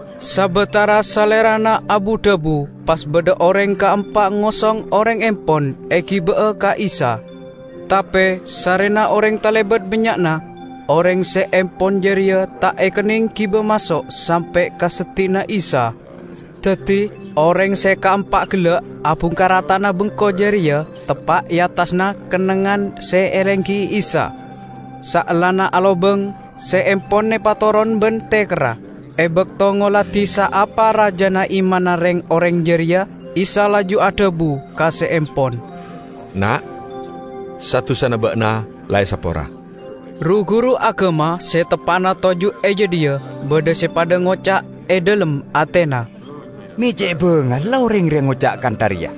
Sabatara Salerana abu-dhabu pas badha oreng kaempa ngosong oreng empon egiba'a ka Isa. Tape sarrena oreng talebat bannya'na, oreng se empon jareya ta' ekenneng giba maso' sampe' ka seddi'na Isa. Daddi, oreng se kaempa gella' abungkar ata'na bengko jareya teppa' e attassa kennengngan se elenggi'i Isa. Saellana alobang, se empon epatoron ban tekerra. E bakto ngoladi saapa rajana imanna reng-oreng jareya, Isa laju adhabu ka se empon, "Na', sa-dusana ba'na la esapora." Ru-guru agama se teppa'na toju' e jadhiya badha se padha ngoca' e dhalem atena, "Me' ce' bangalla oreng reya ngoca' kantha reya!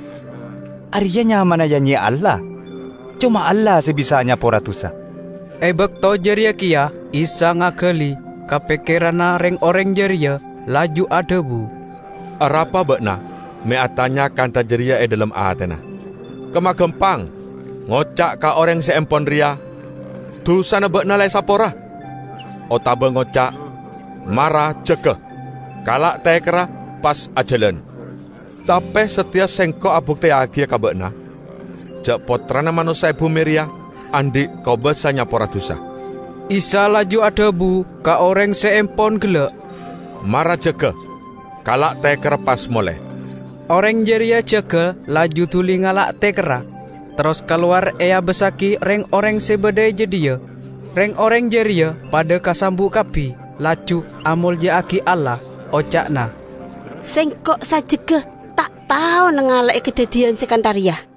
Areya nyamana ya-nyeya Allah! Coma Allah se bisa nyapora dusa." E bakto jareya keya Isa ngagali ka pekkeranna reng-oreng jareya, laju adhabu, "Arapa ba'na me' atanya kantha jareya e dhalem atena? Kemma gampang ngoca' ka oreng se empon reya: 'Dusana ba'na la esapora', otaba ngoca', 'Mara jaga, kala' tekerra pas ajalan'? Tape sateya Sengko' abukteyagiya ka ba'na ja' Pottrana Manossa e bume reya andhi' kobasa nyapora dusa." Isa laju adhabu ka oreng se empon gella', "Mara jaga, kala' tekerra pas mole!" Oreng jareya jaga laju duli ngala' tekerra, terros kalowar eabassagi reng-oreng se badha e jadhiya. Reng-oreng jareya padha kasambu' kabbi laju amolja'agi Allah. Oca'na, "Sengko' sajjegga ta' tao nangale'e kadaddiyan se kantha reya!"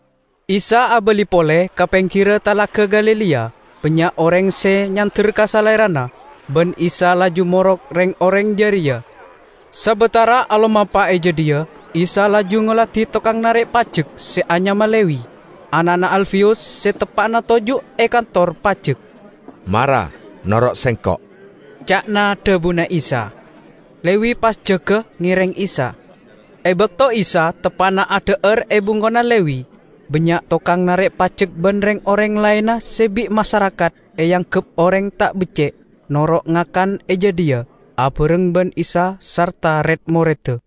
Isa abali pole ka penggirra Talaga Galilea. Bannya' oreng se nyander ka Salerana, ban Isa laju morok reng-oreng jareya. Sabatara alomampa e jadhiya, Isa laju ngoladi tokang narek pajek se anyama Lewi, ana'na Alfeyus, se teppa'na toju' e kantor pajek. "Mara noro' Sengko'," ca'na dhabuna Isa. Lewi pas jaga ngereng Isa. E bakto Isa teppa'na adha'ar e bengkona Lewi, bannya' tokang narek pajek ban reng-oreng laenna se bi' masarakat eanggep oreng ta' becce' noro' ngakan e jadhiya abareng ban Isa sarta red-moredda.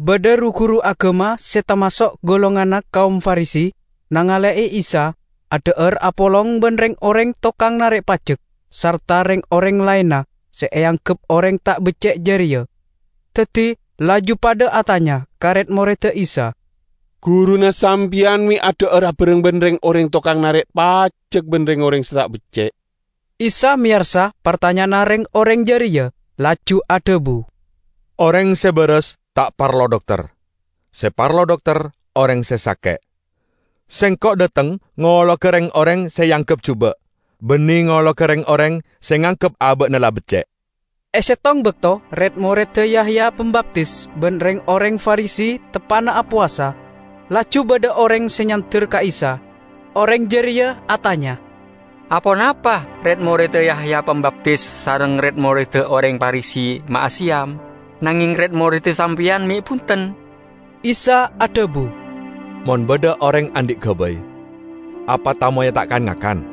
Badha ru-guru agama se tamaso' golonganna kaom Farisi nangale'e Isa adha'ar apolong ban reng-oreng tokang narek pajek sarta reng-oreng laenna se eanggep oreng ta' becce' jareya. Daddi laju padha atanya ka red-moredda Isa, "Guruna sampeyan me' adha'ar abareng ban reng-oreng tokang narek pajek ban reng-oreng se ta' becce'?" Isa meyarsa partanya'anna reng-oreng jareya, laju adhabu, "Oreng se baras ta' parlo dokter; se parlo dokter oreng se sake'. Sengko' dhateng ngologa reng-oreng se eanggep juba', banne ngologa reng-oreng se nganggep aba'na la becce'." E settong bakto red-moredda Yahya Pambaptis ban reng-oreng Farisi teppa'na apowasa. Laju badha oreng se nyander ka Isa; oreng jareya atanya, "Aponapa red-moredda Yahya Pambaptis sareng red-moredda oreng Farisi ma' aseyam, nangeng red-moredda sampeyan me' bunten?" Isa adhabu, "Mon badha oreng andhi' gabay, apa tamoyya ta' kan-ngakan?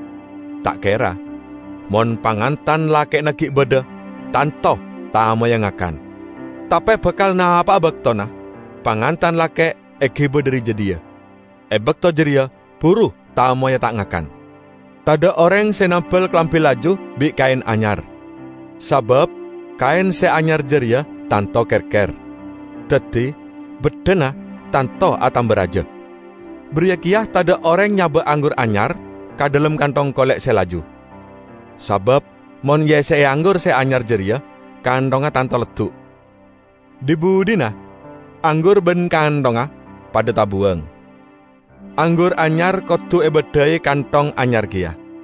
Ta' kera! Mon pangantan lake'na gi' badha, tanto tamoyya ngakan. Tape bakal napa'a baktona pangantan lake' egiba dhari jadhiya. E bakto jareya buru tamoyya ta' ngakan. Tadha' oreng se nambel kalambi laju bi' kaen anyar. Sabab kaen se anyar jareya tanto kerker, daddi beddhana tanto atamba raja. Bariya keya tadha' oreng nyaba' anggur anyar ka dhalem kanthong kole' se laju. Sabab mon eesse'e anggur se anyar jareya kanthongnga tanto leddu'. Dhi-budhina anggur ban kanthongnga padha tabuwang. Anggur anyar kodu ebaddhai kanthong anyar keya!"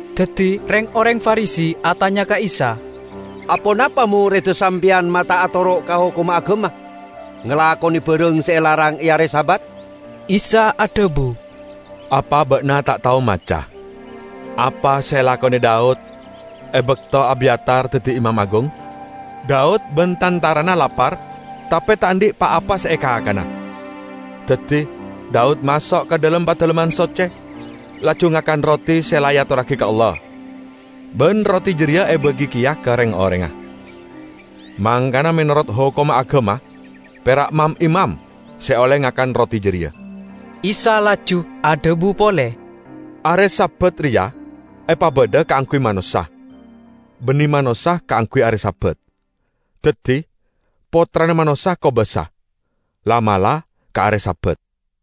Daddi reng-oreng Farisi atanya ka Isa, "Aponapa moredda sampeyan ma' ta' atoro' ka hokomma agama, ngalakone barang se elarang e are Sabat?" Isa adhabu, "Apa ba'na ta' tao maca apa se elakone Daud e bakto Abyatar daddi imam agung? Daud ban tantarana lapar, tape ta' andhi' pa-apa se ekakana. Daddi Daud maso' ka dhalem Padalemman Socce, laju ngakan roti se la eatorragi ka Allah. Ban roti jareya ebagi keya ka reng-orengnga. Mangkana menorot hokomma agama pera' mam-imam se olle ngakan roti jareya." Isa laju adhabu pole, "Are Sabat reya epabadha kaangguy manossa; banne manossa kaangguy are Sabat. Daddi, Pottrana Manossa kobasa, la'-mala' ka are Sabat."